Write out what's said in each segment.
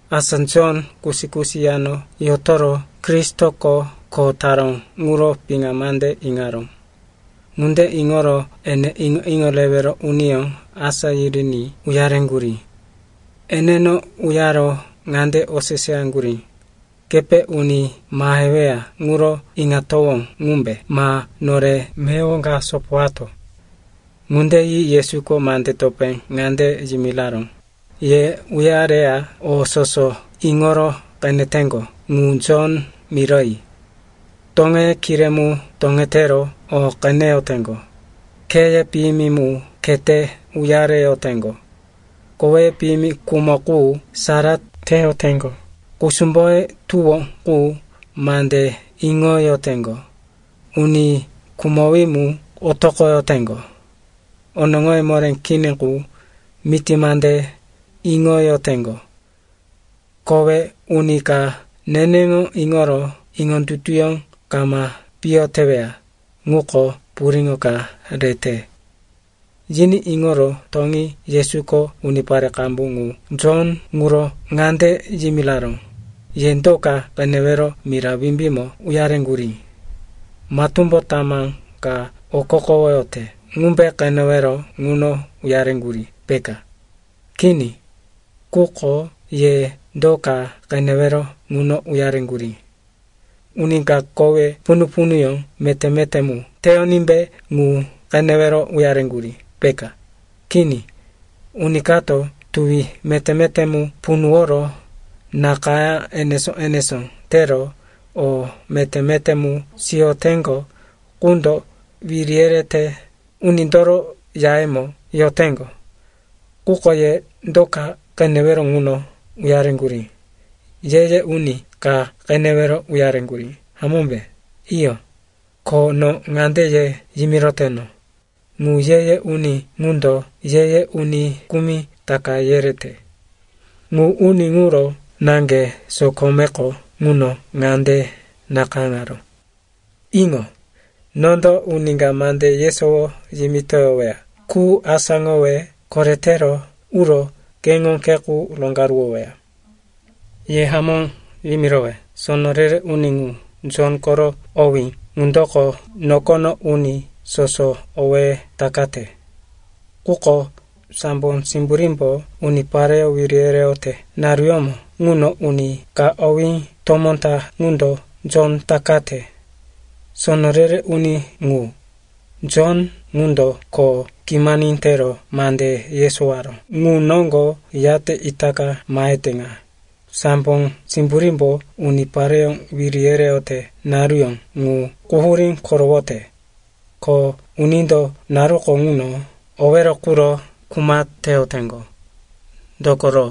Asa Jon kusi-kusi yano yotoro Kristoko kho taró ŋuro piŋa mande iŋaró. Ŋunde iŋoro ene iŋo-iŋo rewero uniyó asá yiriní uyareŋgurí. Eneno uyaro ŋande oseseyaŋgurí, “Kepe uni maheweya ŋuro iŋatowó ŋumbe ma nore meyowo ka sopowato?” Ŋunde yi Yesuko mande topé ŋande yimiraró, “Ye uyareya o soso iŋoro qeneteŋgo ŋu Jon miroyi. Toŋeye kiré mu toŋetero o qeneyoteŋgo, kheye piyimi mu khete uyareyoteŋgo, koweye piyimi khumo qu sara teyoteŋgo, kusumboye tuwo qu mande iŋoyoteŋgo, uni khumowí mu otoqoyoteŋgo, onoŋoye moré kini qu miti mande iŋoyoteŋgo. Kowe uni ka neneŋo iŋoro iŋondutuyó kama piyo teweya ŋuko puriŋo ka rete.” Yiní iŋoro toŋi Yesuko unipare qambu ŋu Jon ŋuro ŋande yimiraró, “Ye do ka qenewero mira wimbímo uyareŋgurí? Matúmbo tamá ka okokowoyote ŋumbe qenewero ŋuno uyareŋgurí, peka? Kini. Quko ye do ka qenewero ŋuno uyareŋgurí? Uni ka kowe punu-punuyó meté-meté mu teyonímbe ŋu qenewero uyareŋgurí, peka? Kini, uni kato tuwi meté-meté mu punuworo nakayá enesó-enesó tero o meté-meté mu siyoteŋgo qundo wiri yerete unindoro yayemo yoteŋgo. Quko ye do ka qenewero ŋuno uyareŋgurí? Ye-ye uni ka qenewero uyareŋgurí, hamómbe? Iyo, ko no ŋande ye yimiroteno, ŋu ye-ye uni ŋundo ye-ye uni kumi taka yerete. Ŋu uni ŋuro naŋge sokomeko ŋuno ŋande nakayáŋaró, “‘Iŋo, nondo uni ka mande yesowo yimitoyoweya qu asáŋowe koretero uro keŋo khe qu roŋgaruwoweya.’ “Ye hamó yimirowe, sono re-re uni ŋu, Jon koro owí ŋundoko nokono uni soso owéye takate. Quko sambo simburímbo unipareyó wiri yereyote naruyómo ŋuno uni ka owí tomó ta ŋundo Jon takate. Sono re-re uni ŋu, Jon, ŋundo kho kimani tero mande yesowaró ŋu noŋgo yate itaka mahete ŋa, sambo simburímbo unipareyó wiri yereyote naruyó ŋu quhurí korowote, ko unindo naruko ŋuno owero quro kuma teyoteŋgo. Dokoro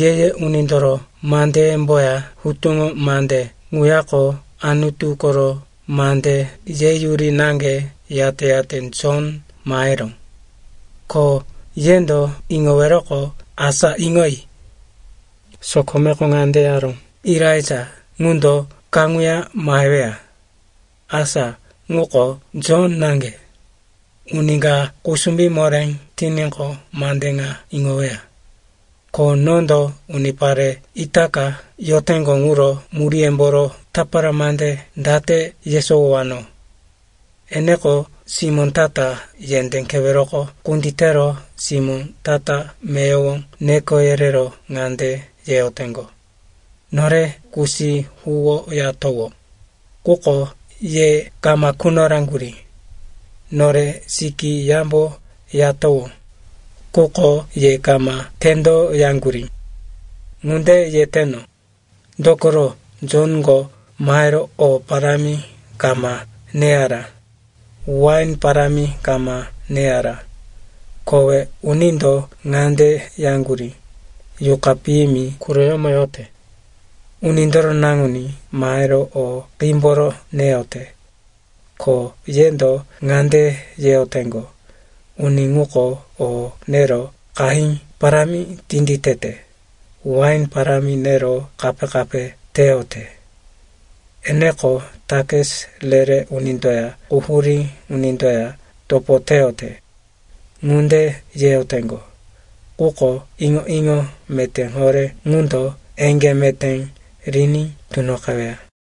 Ye-ye Unindoro mandeyemboya Hutuŋo Mande ŋuyako Anutu koro mande yeyuri naŋge yate-yate Jon maheró. Ko yendo iŋoweroqo, asa iŋoyi. Sokomeko ŋande yaró, Elaija ŋundo kaŋuya maheweya. Asa ŋuko Jon naŋge. Uni ka kusumbí moré tiníqo, mande ŋa iŋoweya. “Ko nondo unipare itaka yoteŋgo ŋuro muríyemboro tapara mande date yesowowano? Eneko simó ta-ta yendé keweroko kunditero simó ta-ta meyowo neko yerero ŋande yeyoteŋgo, “‘Nore kusí huwoyatowó, quko ye kama quno raŋgurí, Nore sikí yambo yatowó, quko ye kama tendoyaŋgurí.’ “Ŋunde yeteno, dokoro Jonko mahero o parámi kama neyara, wain parámi kama neyara. Kowe unindo ŋande yaŋgurí, ‘Yuqa piyimi quroyómo yote.’ Unindoro Naŋuní mahero o qímboro neyote. Ko yendo ŋande yeyoteŋgo, ‘Uni ŋuko o nero qahí parámi tinditete, wain parámi nero kape-kape teyote. Eneko takis re-re unindoya quhurí unindoya topo teyote.’ Ŋunde yeyoteŋgo, quko iŋo-iŋo meté horé ŋundo eŋgé meté riní tunoqeweya.”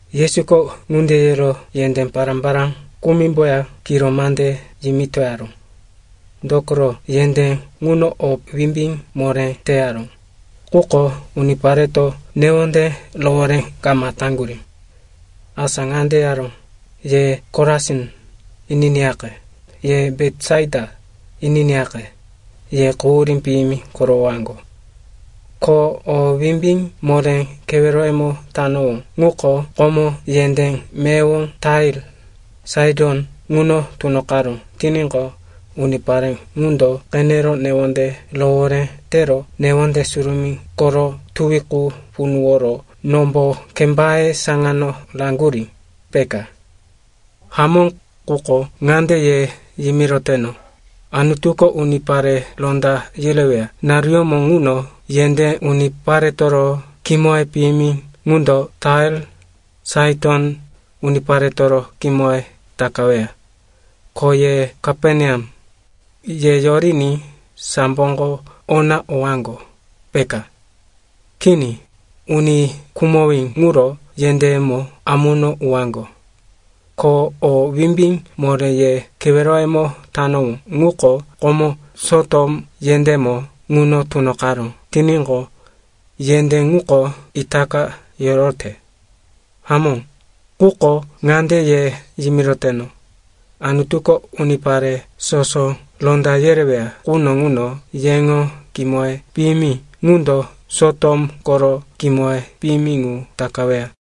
Yesuko ŋunde yero yendé pará-pará kumimboya kiro mande yimitoyaró. Dokoro yendé ŋuno o wimbí moré teyaró, quko unipareto newonde rohoré kama taŋgurí. Asa ŋande yaró, “Ye Korasin, ininiyaqe, ye Betisaita, ininiyaqe. Ye quhurí piyimi korowowaŋgo. Ko o wimbí moré keweroyemo tanowó ŋuko komo yendé meyowo Tair, Saiton ŋuno tunoqaró tiníqo, unipare ŋundo qenero newonde rohoré tero newonde surumí koro tuwi qu punuworo nombo kembaye saŋano raŋaŋgurí, peka. Hamó, quko ŋande ye yimiroteno, Anutuko unipare ronda yereweya naruyómo ŋuno yendé uniparetoro kimoye piyimi ŋundo Tair, Saiton uniparetoro kimoye takaweya. Ko ye Kaperneam, ye yoriní samboko ona owaŋgo, peka? Kini, uni khumowí ŋuro yendéyemo amuno uwaŋgo. Ko o wimbí moré ye keweroyemo tanowó ŋuko komo Sotom yendémo ŋuno tunoqaró tiníqo, yendé ŋuko itaka yorote. Hamó, quko ŋande ye yimiroteno, Anutuko unipare soso ronda yereweya quno ŋuno yeŋo kimoye piyimi ŋundo Sotom koro kimoye piyimi ŋu takaweya.”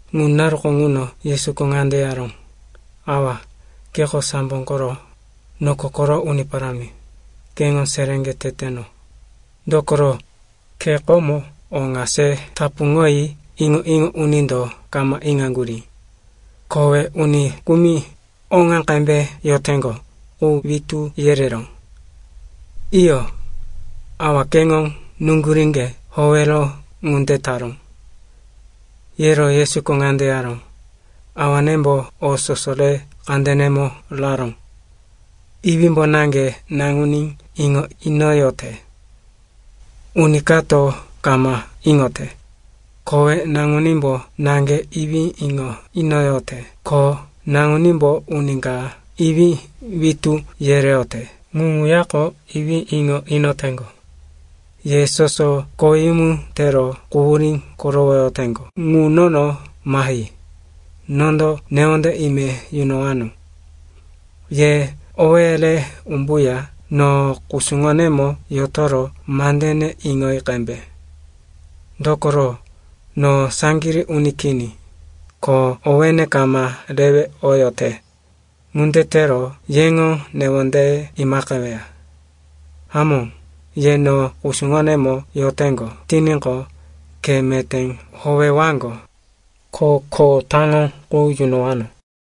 Ŋu naruko ŋuno Yesuko ŋande yaró, “Awa, keko sambo koro, noko koro Uni Parámi. Keŋo seréŋge teteno, dokoro ke komo o ŋa se tapuŋoyi iŋo-iŋo unindo kama iŋaŋgurí. Kowe uni kumi oŋa qembe yoteŋgo qu witú yereró. Iyo, Awa, keŋo nuŋguríŋge howero ŋunde taró.” Yero Yesuko ŋande yaró, “Awanembo o soso re kandenemo raró. Iwímbo naŋge Naŋuní iŋo inoyote, uni kato kama iŋote. Kowe Naŋunímbo naŋge Iwí iŋo inoyote, ko Naŋunímbo uni ka Iwí witú yereyote ŋu ŋuyako Iwí iŋo inoteŋgo. “Ye soso koweyumu tero quhurí korowoyoteŋgo ŋu nono mahi. Nondo newonde ime yunowano. Ye owéye re umbuya no kusuŋonemo yotoro mandene iŋoyi qembe. Dokoro no saŋgirí uni kini, ko owéne kama rewe oyote. Ŋunde tero yeŋo newondeye imaqeweya. Hamó, ye no kusuŋonemo yoteŋgo tiníqo, khe meté howewaŋgo, ko kho taŋo qu yunowano.”